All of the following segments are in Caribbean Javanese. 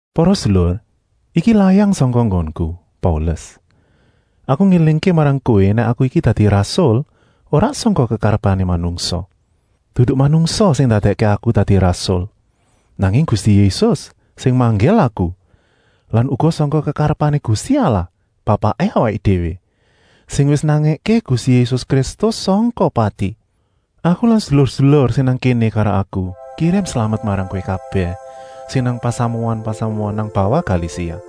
Para sedulur, iki layang sangka nggonku, Paulus. Aku ngélingké marang kowé nèk aku iki dadi rasul ora sangka kekarepané manungsa. Dudu manungsa sing ndadèkké aku dadi rasul, nanging Gusti Yésus sing manggil aku lan uga sangka kekarepané Gusti Allah, Bapaké awaké déwé, sing wis nangèké Gusti Yésus Kristus sangka pati. Aku lan sedulur-sedulur sing nang kéné karo aku kirim slamet marang kowé kabèh sing nang pasamuan-pasamuan nang bawah Galasia.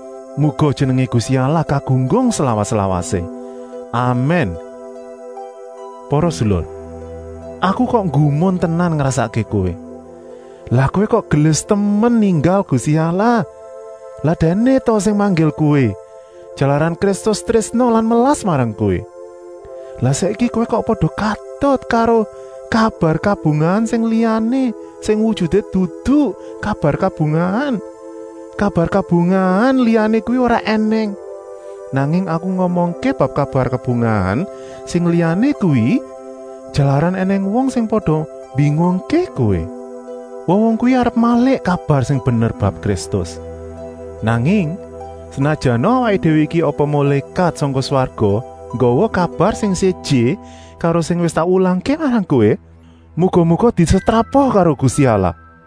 Muga jenengé Gusti Allah kagunggung slawas-lawasé! Amèn. Para sedulur, aku kok nggumun tenan ngrasakké kowé. Lah kowé kok gelis temen ninggal Gusti Allah. Lak Dèkné ta sing manggil kowé, jalaran Kristus trésna lan melas marang kowé. Lah saiki kowé kok pada katut karo “kabar kabungahan” sing liyané, sing wujuté dudu kabar kabungahan. “Kabar kabungahan” liyané kuwi ora ènèng! Nanging aku ngomongké bab “kabar kabungahan” sing liyané kuwi jalaran ènèng wong sing pada mbingungké kowé. Wong-wong kuwi arep malik kabar sing bener bab Kristus. Nanging, senajana awaké déwé iki apa mulékat sangka swarga nggawa kabar sing séjé karo sing wis tak wulangké marang kowé, muga-muga disetrapa karo Gusti Allah.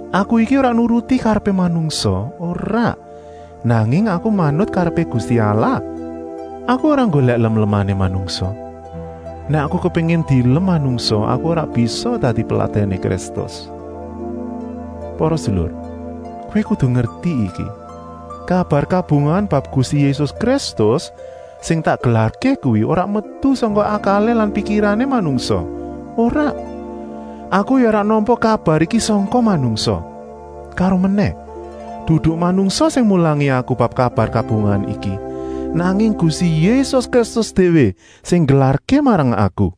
Aku iki ora nuruti karepé manungsa, ora, nanging aku manut karepé Gusti Allah. Aku ora nggolèk lemlemané manungsa. Nèk aku kepéngin dielem manungsa aku ora bisa dadi peladèné Kristus. Para sedulur, kowé kudu ngerti iki! Kabar kabungahan bab Gusti Yésus Kristus sing tak gelarké kuwi ora metu sangka akalé lan pikirané manungsa, ora. Aku ya ora nampa kabar iki sangka manungsa. Karomenèh, dudu manungsa sing mulangi aku bab kabar kabungahan iki, nanging Gusti Yésus Kristus déwé sing nggelarké marang aku.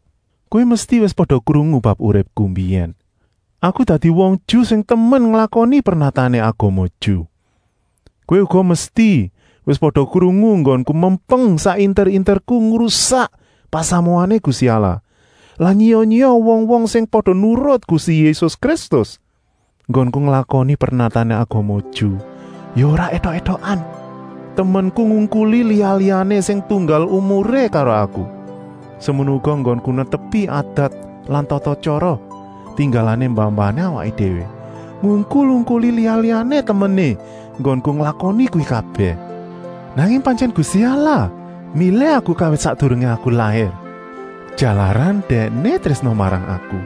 Kowé mesti wis pada krungu bab uripku mbiyèn. Aku dadi wong Ju sing temen nglakoni pernatané agama Ju. Kowé uga mesti wis pada krungu enggonku mempeng sak inter-interku ngrusak pasamuané Gusti Allah lan nyiya-nyiya wong-wong sing pada nurut Gusti Yésus Kristus. Enggonku nglakoni pernatané agama Ju ya ora étok-étokan. Temenku ngungkuli liya-liyané sing tunggal umuré karo aku. Semono uga enggonku netepi adat lan tata-tyara tinggalané mbah-mbahané awaké déwé, ngungkul-ungkuli liya-liyané temené enggonku nglakoni kuwi kabèh. Nanging pantyèn Gusti Allah milih aku kawit sakdurungé aku lair, jalaran Dèkné trésna marang aku.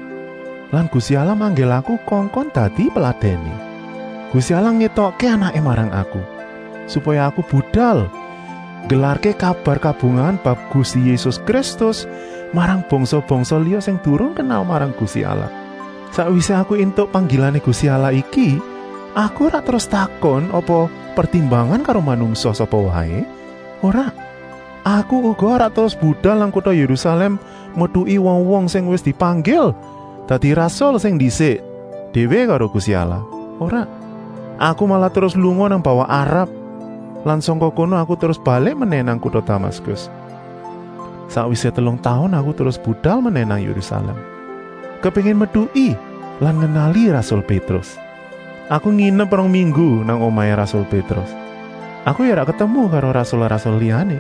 Lan Gusti Allah manggil aku kongkon dadi peladèné. Gusti Allah ngétokké Anaké marang aku, supaya aku budal nggelarké kabar kabungahan bab Gusti Yésus Kristus marang bangsa-bangsa liya sing durung kenal marang Gusti Allah. Sakwisé aku éntuk panggilané Gusti Allah iki aku ora terus takon apa pertimbangan karo manungsa sapa waé, ora. Aku uga ora terus budal nang kuta Yérusalèm metuki wong-wong sing wis dipanggil dadi rasul sing ndisik déwé karo Gusti Allah, ora. Aku malah terus lunga nang bawah Arab lan sangka kono aku terus balik menèh nang kuta Damaskus. Sakwisé telung taun aku terus budal menèh nang Yérusalèm, kepéngin metuki lan ngenali rasul Pétrus. Aku nginep rong minggu nang omahé rasul Pétrus. Aku ya ora ketemu karo rasul-rasul liyané,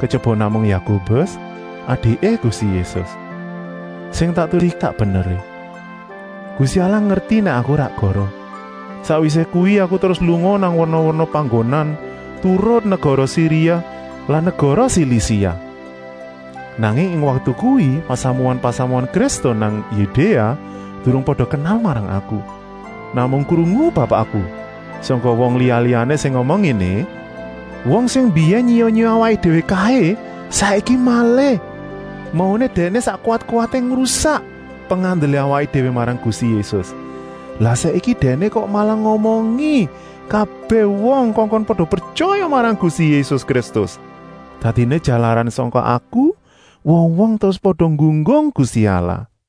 kejaba namung Yakobus, adiké Gusti Yésus. Sing tak tulis iki sak beneré. Gusti Allah ngerti nèk aku ora goroh. Sakwisé kuwi aku terus lunga nang werna-werna panggonan turut negara Siria lan negara Silisia. Nanging ing waktu kuwi pasamuan-pasamuan Kristen nang Yudéa durung pada kenal marang aku. Namung krungu bab aku sangka wong liya-liyané sing ngomong ngéné: “Wong sing mbiyèn nyiya-nyiya awaké déwé kaé saiki malih. Mauné dèkné sak kuwat-kuwaté ngrusak pengandelé awaké déwé marang Gusti Yésus. Lah saiki dèkné kok malah ngomongi kabèh wong kongkon pada pretyaya marang Gusti Yésus Kristus.” Dadiné jalaran sangka aku wong-wong terus pada nggunggung Gusti Allah.